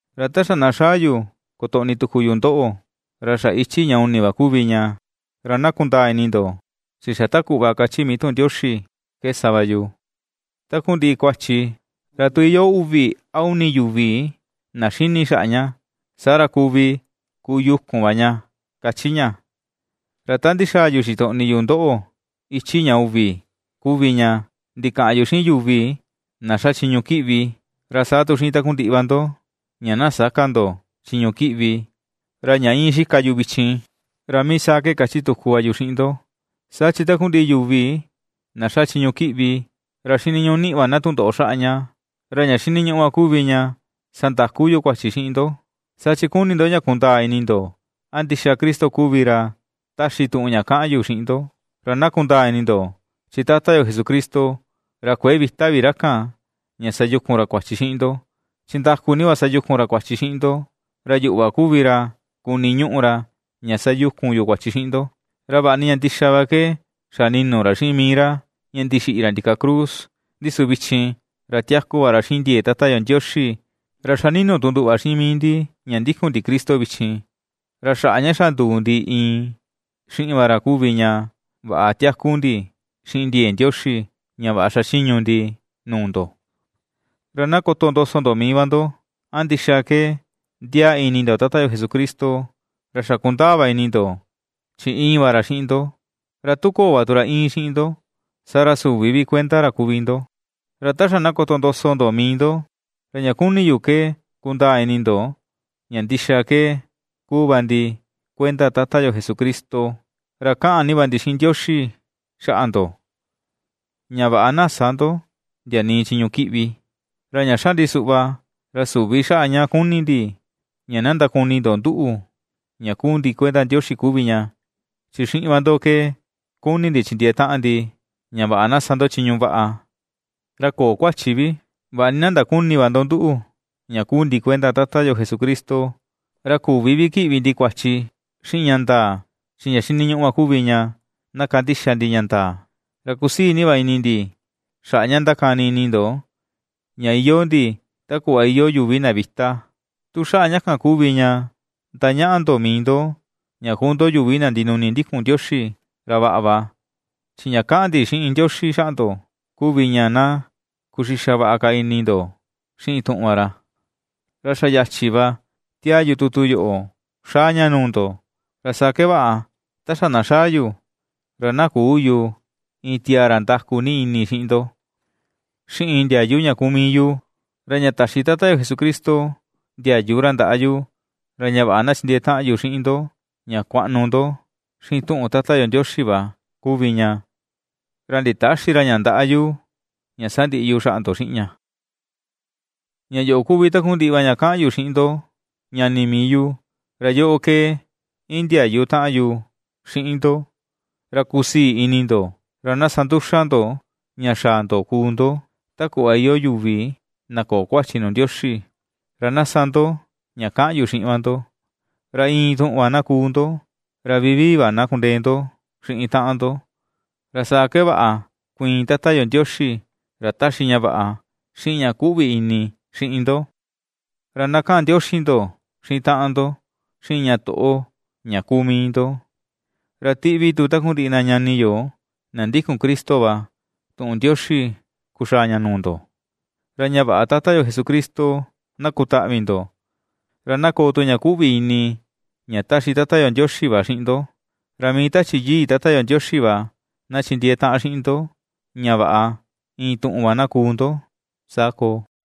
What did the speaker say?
Ra ta xa na xaa yu kotoꞌni tuku yu ndoꞌo, ra xa ichi ña uni va kuvi ña. Ra na kundaa ini ndo chi xa ta kuꞌva ^kachi mii tuꞌun Ndioxi ke sa va yu: “Takundiꞌi kuachi, ra tu iyoo uvi a uni yuvi na xini xaꞌa ña, saa ra kuvi kuyukun va ña”, kachi ña. Ra ta ndixaa yu xitoꞌni yu ndoꞌo ichi ña uvi kuvi ña, ndikaꞌan yu xiꞌin yuvi na xa chiñu kiꞌvi, ra saa tu xiꞌin takundiꞌi va ndo, ña na sä ka ndo chiñu kiꞌvi. Ra ña íin xika yu vichin, ra mii saa ke kachi tuku va yu xiꞌin ndo, saa chi takundiꞌi yuvi na ^xa chiñu kiꞌvi, ra xiniñuꞌu niꞌi va na tundoꞌo xaꞌa ña. Ra ña xiniñuꞌu va kuvi ña sandaku yu kuachi xiꞌin ndo, saa chi kuni ndo ña kundaa ini ndo a ndixa Cristo kuvi ra ^taxi tuꞌun ña kaꞌan yu xiꞌin ndo. Ra na kundaa ini ndo, chi Tata yo Jesucristo, ra kuëe vita vi ra kan ña sayukun ra kuachi xiꞌin ndo, chi ndaku ni va sayukun ra kuachi xiꞌin ndo, ra yuꞌu va kuvi ra kuniñuꞌu ra, ña sayukun yu kuachi xiꞌin ndo. Ra vaꞌa ni ña ndixa va ke xa ninu ra xiꞌin mii ra, ña ndixiꞌi ra ndika cruz, ndi su vichin, ra tiaku va ra xiꞌin ndiee Tata yo Ndioxi. Ra ^xa ninu tu nduꞌu va xiꞌin mii ndi ña ndikun ndi Cristo vichin: ra xaꞌa ña xa nduu ndi iin xiꞌin va ra kuvi ña vaꞌa tiaku ndi xiꞌin ndiee Ndioxi, ña vaꞌa xachiñu ndi nuu ndo. Ra na kotondoso ndo mii va ndo, a ndixa ke ndiaa ini ndo Tata yo Jesucristo; ra xa kundaa va ini ndo chi íin va ra xiꞌin ndo, ra tu köo va tu ra íin xiꞌin ndo, saa ra süvi vi kuenda ra kuvi ndo. Ra ta xa na kotondoso ndo mii ndo, ra ña kuni yu ke kundaa ini ndo, ña ndixa ke kuu va ndi kuenda Tata yo Jesucristo. Ra kaꞌan ni va ndi xiꞌin Ndioxi xaꞌa ndo, ña vaꞌa na sä ndo ndia nii chiñu kiꞌvi. Ra ña xa ndi suꞌva, ra süvi xaꞌa ña kuni ndi ña na ndakuni ndo nduꞌu ña kuu ndi kuenda Ndioxi kuvi ña, chi xiꞌin va ndo ke kuni ndi chindiee taꞌan ndi, ña vaꞌa na sa ndo chiñu vaꞌa, ra köo kuachi vi, vaꞌa ni na ^ndaküni va ndo nduꞌu ña kuu ndi kuenda Tata yo Jesucristo. Ra ^küvi vi kiꞌvi ndi kuachi xiꞌin ña ndaa, chi ña xiniñuꞌu va kuvi ña na kandixa ndi ña ndaa. Ra kusii ni va ini ndi xaꞌa ña ndakani ini ndo ña iyoo ndi ta kuꞌva iyoo yuvi na vita, tu xaꞌa ña kan kuvi ña ndañaꞌa ndo mii ndo, ña kuu ndo yuvi na ndinuni ndikun Ndioxi, ra vaꞌa va, chi ña kaꞌan ndi xiꞌin Ndioxi xaꞌa ndo kuvi ña na kuxixa vaꞌa ka ini ndo xiꞌin tuꞌun va ra. Ra xa yachi va ^tiaa yu tutu yoꞌo xaa ña nuu ndo, ra saa ke vaꞌa ta xa na xaa yu, ra na küu yu iin tiaa ra ndaku ni ini xiꞌin ndo. Xiꞌin ndiayu ña kuu mii yu, ra ña taxi Tata yo Jesucristo ndiayu ra ndaꞌa yu, ra ña vaꞌa na chindiee taꞌan yu xiꞌin ndo ña kuaꞌnu ndo xiꞌin tuꞌun Tata yo Ndioxi va kuvi ña, ra nditäxi ra ña ndaꞌa yu, ña sandiꞌi yu xaꞌa ndo xiꞌin ña. Ña yoꞌo kuvi takundiꞌi va ña kaꞌan yu xiꞌin ndo, ñani mii yu. Ra yoꞌo ke indiayu taꞌan yu xiꞌin ndo, ra na kusii ini ndo, ra na sa nduxa ndo ña xaa ndo kuu ndo ta kuꞌva iyoo yuvi na köo kuachi nuu Ndioxi. Ra na sa ndo ña kaꞌan yu xiꞌin va ndo, ra iin tuꞌun va na kuu ndo, ra vivii va na kundee ndo xiꞌin taꞌan ndo. Ra saa ke vaꞌa kuiin Tata yo Ndioxi, ra taxi ña vaꞌa, xiꞌin ña kuꞌvi ini, xiꞌin ndo. Ra na kaꞌan ndioxi ndo xiꞌin taꞌan ndo, xiꞌin ña toꞌo ña kuu mii ndo. Ra tiꞌvi tu takundiꞌi na ñani yo na ndikun Cristo va tuꞌun ndioxi kuxaa ña nuu ndo. Ra ña vaꞌa Tata yo Jesucristo na kutaꞌvi ndo, ra na koo tu ña kuꞌvi ini ña ^taxi Tata yo Ndioxi va xiꞌin ndo, ra mii Tachi Yii Tata yo Ndioxi va na chindiee taꞌan xiꞌin ndo, ña vaꞌa iin tuꞌun va na kuu ndo. Saa koo.